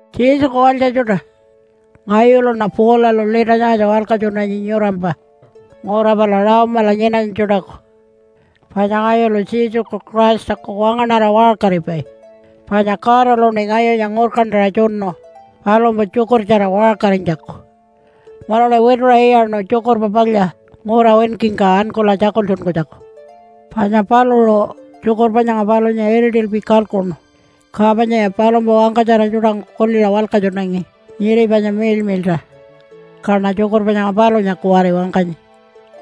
Jesuku walytja tjuṯa! Ngayuluṉa Paulalu lita nyangatja walkatjunanyi nyurampa ngura pala Rome-ala nyinanytja tjuṯaku. Panya ngayulu Jesuku Christaku wangaṉara waṟkaripai. Panya Godaluṉi ngayunya ngurkantaṟa tjunu palumpa tjukurtjara waṟkarinytjaku munuṉi wituṟa iyaṉu Tjukurpa Palya ngura winkingka ankula tjakultjunkunytjaku. Panya paluṟu tjukurpa nyanga palunya iritilpi kalkuṉu, ka panyaya palumpa wangkatjara tjuṯangku kuliṟa walkatjunangi nyiri panya miḻmiḻṯa. Kaṉa tjukurpa nyanga palunya kuwari wangkanyi.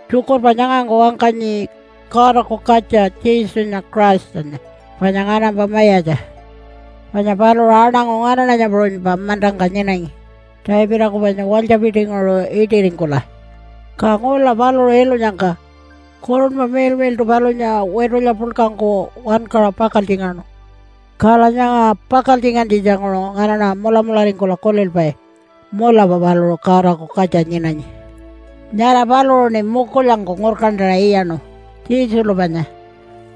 Tjukurpa nyangangku wangkanyi Godaku katja Jesunya Christanya panya nganampa mayatja. Panya paluṟu aṉangu nganaṉanya puṟunypa mantangka nyinangi Davidaku panya walytjapitinguṟu iṯiringkula. Ka ngula paluṟu ilunyangka Kurunpa Miḻmiḻṯu palunya witulya puḻkangku wankaṟa pakaltjingaṉu, kala nyanga pakaltjingantjitjanguṟu nganaṉa mulamularingkula kulilpai, “Mulapa paluṟu Godaku katja nyinanyi.” Nyara paluṟuṉi mukulyangku ngurkantaṟa iyaṉu, Jesulu panya,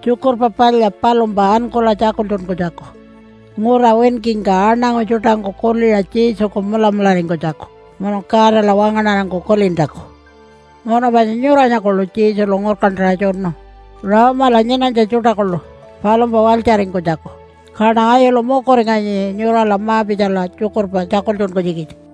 Tjukurpa Palya palumpa ankula tjakultjunkunytjaku ngura winkingka aṉangu tjuṯangku kuliṟa Jesuku mulamularingkunytjaku munu Godala wangaṉarangku kulintjaku. Munu panya nyuranya kuḻu Jesulu ngurkantaṟa tjunu Rome-ala nyinanytja tjuṯa kuḻu palumpa walytjaringkunytjaku, kaṉa ngayulu mukuringanyi nyurala ma-pitjala tjukurpa tjakultjunkunytjikitja.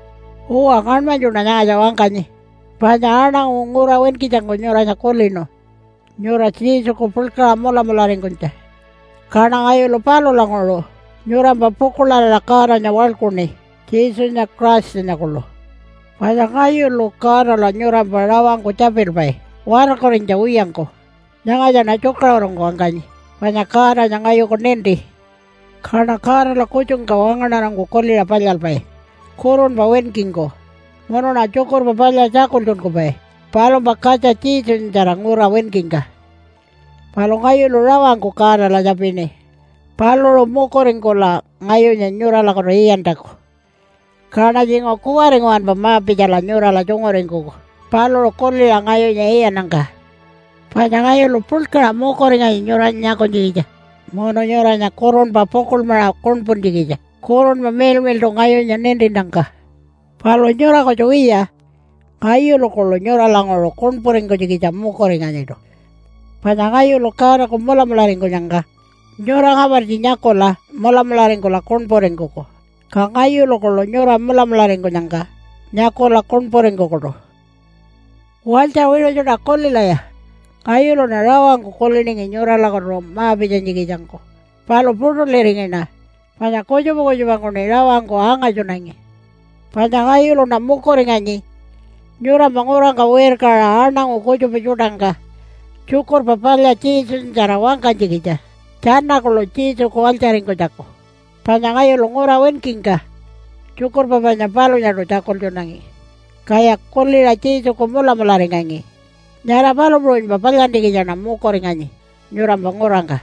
Uwa ngaṉmanytjuṉa nyangatja wangkanyi panya aṉangu ngura winkitjangku nyuranya kulinu nyura Jesuku puḻkaṟa mulamularingkunytja. Kaṉa ngayulu palulanguṟu nyurampa pukuḻarira Godanya waḻkuṉi Jesunya Christanya kuḻu. Panya ngayulu Godala nyurampa rawangku tjapilpai watarkurinytja wiyangku. Nyangatjaṉa tjukaṟurungku wangkanyi panya Godanya ngayuku ninti. Kaṉa Godala kutjungka wangaṉarangku kuliṟa palyalpai kurunpa winkingku munuṉa Tjukurpa Palya tjakultjunkupai palumpa katja Jesunyatjara ngura winkingka. Palu ngayulu rawangku Godala tjapini paluṟu mukuringkula ngayunya nyuralakutu iyantjaku, kaṉa tjinguṟu kuwari nguwanpa ma-pitjala nyurala tjunguringkuku paluṟu kuliṟa ngayunya iyannyangka. Panya ngayulu puḻkaṟa mukuringanyi nyuranya nyakunytjikitja munu nyuranya kurunpa pukuḻmaṟa kuṉpuntjikitja Kurunpa Miḻmiḻṯu ngayunya nintinnyangka. Palu nyura kutju wiya, ngayulu kuḻu nyuralanguṟu kuṉpuringkunytjikitja mukuringanyiṯu. Panya ngayulu Godaku mulamularingkunyangka nyura ngapartji nyakula mulamularingkula kuṉpuringkuku, ka ngayulu kuḻu nyura mulamularingkunyangka nyakula kuṉpuringkukuṯu. Walytja wiṟu tjuṯa, kulilaya! Ngayuluṉa rawangku kuliningi nyuralakutu ma-pitjanytjikitjangku palu puṯulirinyiṉa, panya kutjupa kutjupangkuṉi rawangku angatjunanyi. Panya ngayuluṉa mukuringanyi nyurampa ngurangka wirkaṟa aṉangu kutjupa tjuṯangka Tjukurpa Palya Jesunyatjara wangkanytjikitja tjana kuḻu Jesuku walytjaringkunytjaku. Panya ngayulu ngura winkingka tjukurpa panya palunyaṯu tjakultjunangi, kaya kuliṟa Jesuku mulamularingangi, nyara palu puṟunypa palyantjikitjaṉa mukuringanyi nyurampa ngurangka.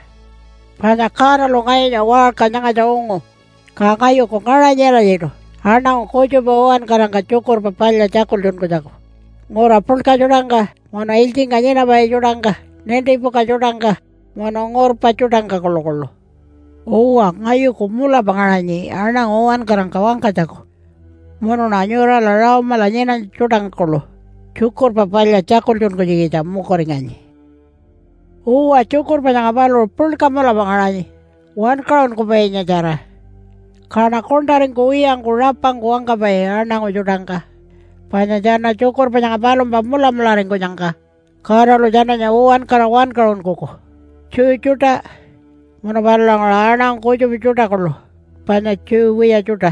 Panya Godalu ngayunya waṟka nyangatja ungu, ka ngayuku ngaṟanyi alatjiṯu aṉangu kutjupa uwankarangka Tjukurpa Palya tjakultjunkunytjaku ngura puḻka tjuṯangka, munu ilytjingka nyinapai tjuṯangka, nintipuka tjuṯangka munu ngurpa tjuṯangka kuḻukuḻu. Uwa, ngayuku mulapa ngaṟanyi aṉangu uwankarangka wangkanytjaku, munuṉa nyurala Rome-ala nyinanytja tjuṯangka kuḻu Tjukurpa Palya tjakultjunkunytjikitja mukuringanyi. Uwa, tjukurpa nyanga paluṟu puḻka mulapa ngaṟanyi wankaṟunkupainyatjara. Kaṉa kuṉṯaringkuwiyangku rapangku wangkapai aṉangu tjuṯangka, panya tjana tjukurpa nyanga palumpa mulamularingkunyangka Godalu tjananya uwankara wankaṟunkuku, Jew tjuṯa munu palulanguṟu aṉangu kutjupa tjuṯa kuḻu panya Jew wiya tjuṯa.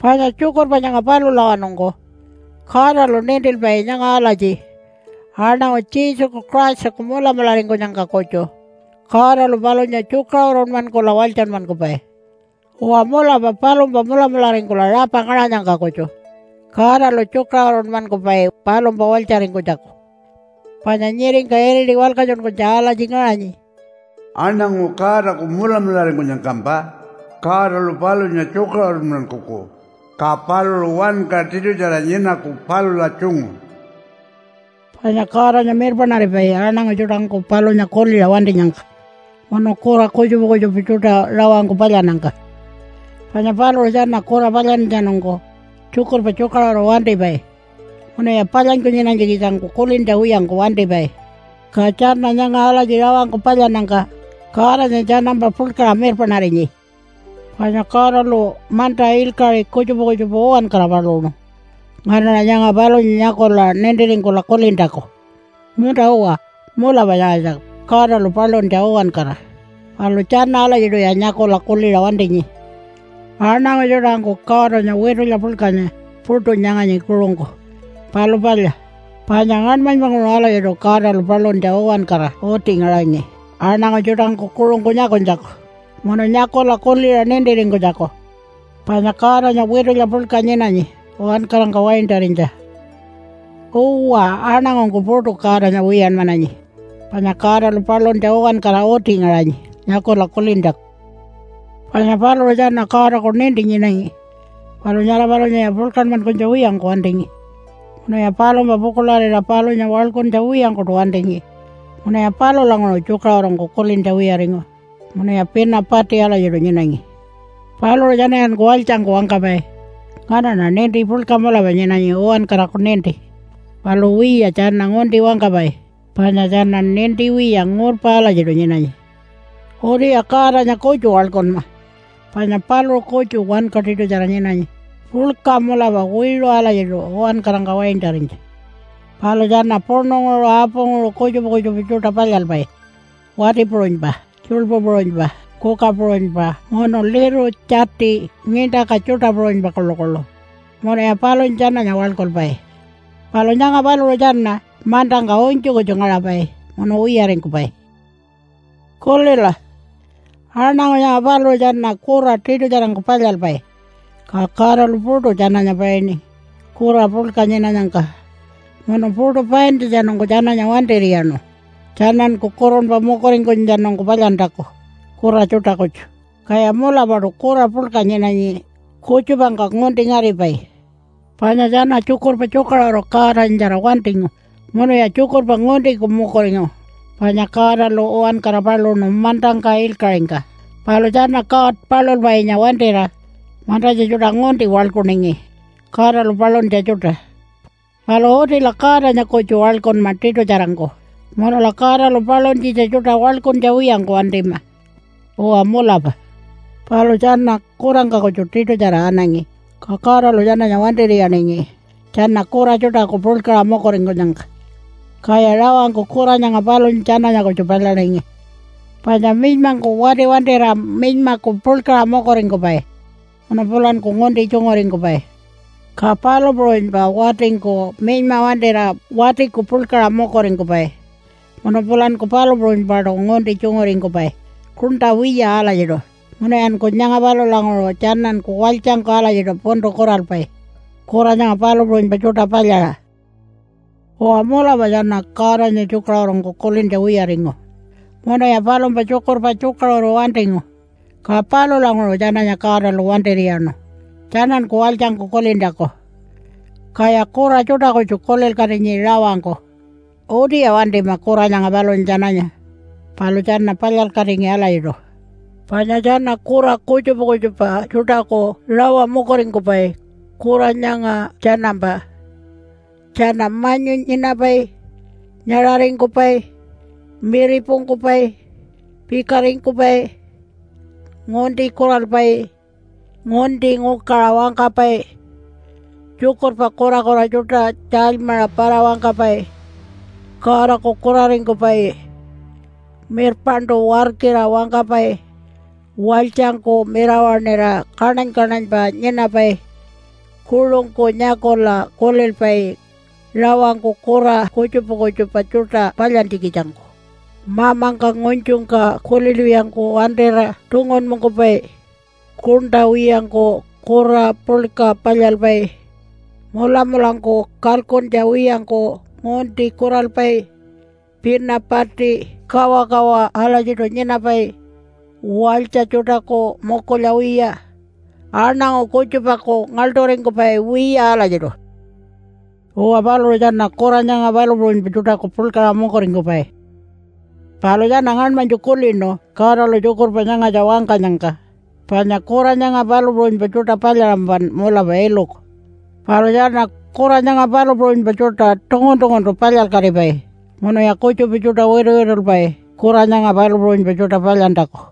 Panya tjukurpa nyanga palulawanungku Godalu nintilpai nyanga alatji aṉangu Jesuku Christaku mulamularingkunyangka kutju Godalu palunya tjukaṟurunmankula walytjanmankupai. Uwa mulapa, palumpa mulamularingkula rapa ngaṟanyangka kutju Godalu tjukaṟurunmankupai palumpa walytjaringkunytjaku. Panya nyiringka iriti walkatjunkunytja alatji ngaṟanyi, “Aṉangu Godaku mulamularingkunyangkampa Godalu palunya tjukaṟurunmankuku, ka paluṟu wanka tiṯutjara nyinaku palula tjungu.” Panya Godanya mirpaṉaripai aṉangu tjuṯangku palunya kuliṟa wantinyangka munu kura kutjupa kutjupa tjuṯa rawangku palyannyangka. Panya paluṟu tjana kura palyantjatjanungku tjukurpa tjukaṟuru wantipai munuya palyanyku nyinanytjikitjangku kulintja wiyangku wantipai. Ka tjana nyanga alatji rawangku palyannyangka Godanya tjanampa puḻkaṟa mirpaṉarinyi. Panya Godalu manta, ilkaṟi kutjupa kutjupa uwankara paluṉu nganaṉa nyanga palunya nyakula nintiringkula kulintjaku, “Munta-uwa, mulapa nyangatja Godalu paluntja uwankara.” Palu tjana alatjiṯuya nyakula kuliṟa wantinyi. Aṉangu tjuṯangku Godanya witulya puḻkanya puṯu nyanganyi kuṟungku, palu palya, panya ngaṉmanypanguṟu alatjiṯu Godalu paluntja uwankara uti ngaṟangi aṉangu tjuṯangku kuṟungku nyakunytjaku, munu nyakula kuliṟa nintiringkunytjaku panya Godanya witulya puḻka nyinanyi uwankarangka waintarinytja. Uwa, aṉangungku puṯu Godanya wiyanmananyi panya Godalu paluntja uwankara uti ngaṟanyi nyakula kulintjaku. Panya paluṟu tjana Godaku ninti nyinangi, palu nyara palunyaya puḻkanmankunytja wiyangku wantingi, munuya palumpa pukuḻarira palunya waḻkuntja wiyangkuṯu wantingi. Munuya palulanguṟu tjukaṟurungku kulintja wiyaringu munuya pina pati alatjiṯu nyinangi. Paluṟu tjanayanku walytjangku wangkapai, “Nganaṉa ninti puḻka mulapa nyinanyi, uwankaraku ninti.” Palu wiya, tjana ngunti wangkapai panya tjana ninti wiya ngurpa alatjiṯu nyinanyi. Utiya Godanya kutju waḻkunma panya paluṟu kutju wanka tiṯutjara nyinanyi puḻka mulapa wiṟu alatjiṯu uwankarangka waintarinytja. Palu tjana puṉunguṟu apunguṟu kutjupa kutjupa tjuṯa palyalpai wati puṟunypa, tjuḻpu puṟunypa, kuka puṟunypa, munu liru, tjati, ngiṉṯaka tjuṯa puṟunypa kuḻukuḻu, munuya palunya tjananya waḻkulpai. Palu nyanga paluṟu tjana mantangka unytju kutju ngaṟapai munu wiyaringkupai. Kulila! Aṉangu nyanga paluṟu tjana kura tiṯutjarangku palyalpai, ka Godalu puṯu tjananya painingi kura puḻka nyinanyangka munu puṯu paintjatjanungku tjananya wantir'iyaṉu tjananku kurunpa mukuringkunytjatjanungku palyantjaku kura tjuṯa kutju, kaya mulapaṯu kura puḻka nyinanyi kutjupangka ngunti ngaripai. Panya tjana tjukurpa tjukaṟuru Godanyatjara wantingu munuya tjukurpa nguntiku mukuringu. Panya Godalu uwankara paluṉu mantangka ilkaṟingka, palu tjana God palulpainya wantira mantatja tjuṯa ngunti waḻkuningi, Godalu paluntja tjuṯa. Palu utila Godanya kutju waḻkunma tiṯutjarangku munula Godalu paluntjitja tjuṯa waḻkuntja wiyangku wantima. Uwa mulapa. Palu tjana kurangka kutju tiṯutjara anangi, ka Godalu tjananya wantir'iyaningi tjana kura tjuṯaku puḻkaṟa mukuringkunyangka, kaya rawangku kura nyanga palunya tjananya kutju palyaningi. Panya minymangku wati wantira minymaku puḻkaṟa mukuringkupai munu pulanku ngunti tjunguringkupai. Ka palu puṟunypa watingku minyma wantira watiku puḻkaṟa mukuringkupai, munu pulanku palu puṟunypaṯu ngunti tjunguringkupai kuṉṯa wiya alatjiṯu. Munuyanku nyanga palulanguṟu tjananku walytjangku alatjiṯu puntu kuralpai kura nyanga palu puṟunypa tjuṯa palyaṟa. Uwa mulapa tjana Godanya tjukaṟurungku kulintja wiyaringu munuya palumpa tjukurpa tjukaṟuru wantingu, ka palulanguṟu tjananya Godalu wantir'iyaṉu tjananku walytjangku kulintjaku. Kaya kura tjuṯa kutju kulilkatinyi rawangku. Utiya wantima kura nyanga palunya tjananya, palu tjana palyalkatingi alatjiṯu. Panya tjana kura kutjupa kutjupa tjuṯaku rawa mukuringkupai kura nyanga tjanampa: -Tjana manyu nyinapai, -nyaṟaringkupai, -miripungkupai, -pikaringkupai, -ngunti kuralpai, -ngunti ngukaṟa wangkapai, -tjukurpa kurakura tjuṯa tjaalymaṟa para-wangkapai, -Godaku kuraringkupai, -mirpaṉṯu warkira wangkapai, -walytjangku mirawaṉira kaṉany-kaṉanypa nyinapai, -kuṟungku nyakula kulilpai rawangku kura kutjupa kutjupa tjuṯa palyantjikitjangku, -mamangka ngunytjungka kulilwiyangku wantira tungunpungkupai, -kuṉṯa wiyangku kura puḻka palyalpai, -mulamulangku kalkuntja wiyangku ngunti kuralpai, -pina pati, kawakawa alatjiṯu nyinapai, -walytja tjuṯaku mukulya wiya, -aṉangu kutjupaku ngaḻṯuringkupai wiya alatjiṯu. Uwa paluṟu tjana kura nyanga palu puṟunypa tjuṯaku puḻkaṟa mukuringkupai. Palu tjana ngaṉmanytju kulinu Godalu tjukurpa nyangatja wangkanyangka panya, “Kura nyanga palu puṟunypa tjuṯa palyaṟampan mulapa iluku.” Palu tjana kura nyanga palu puṟunypa tjuṯa tungun-tunguntu palyalkatipai, munuya kutjupa tjuṯa wituwitulpai kura nyanga palu puṟunypa tjuṯa palyantjaku.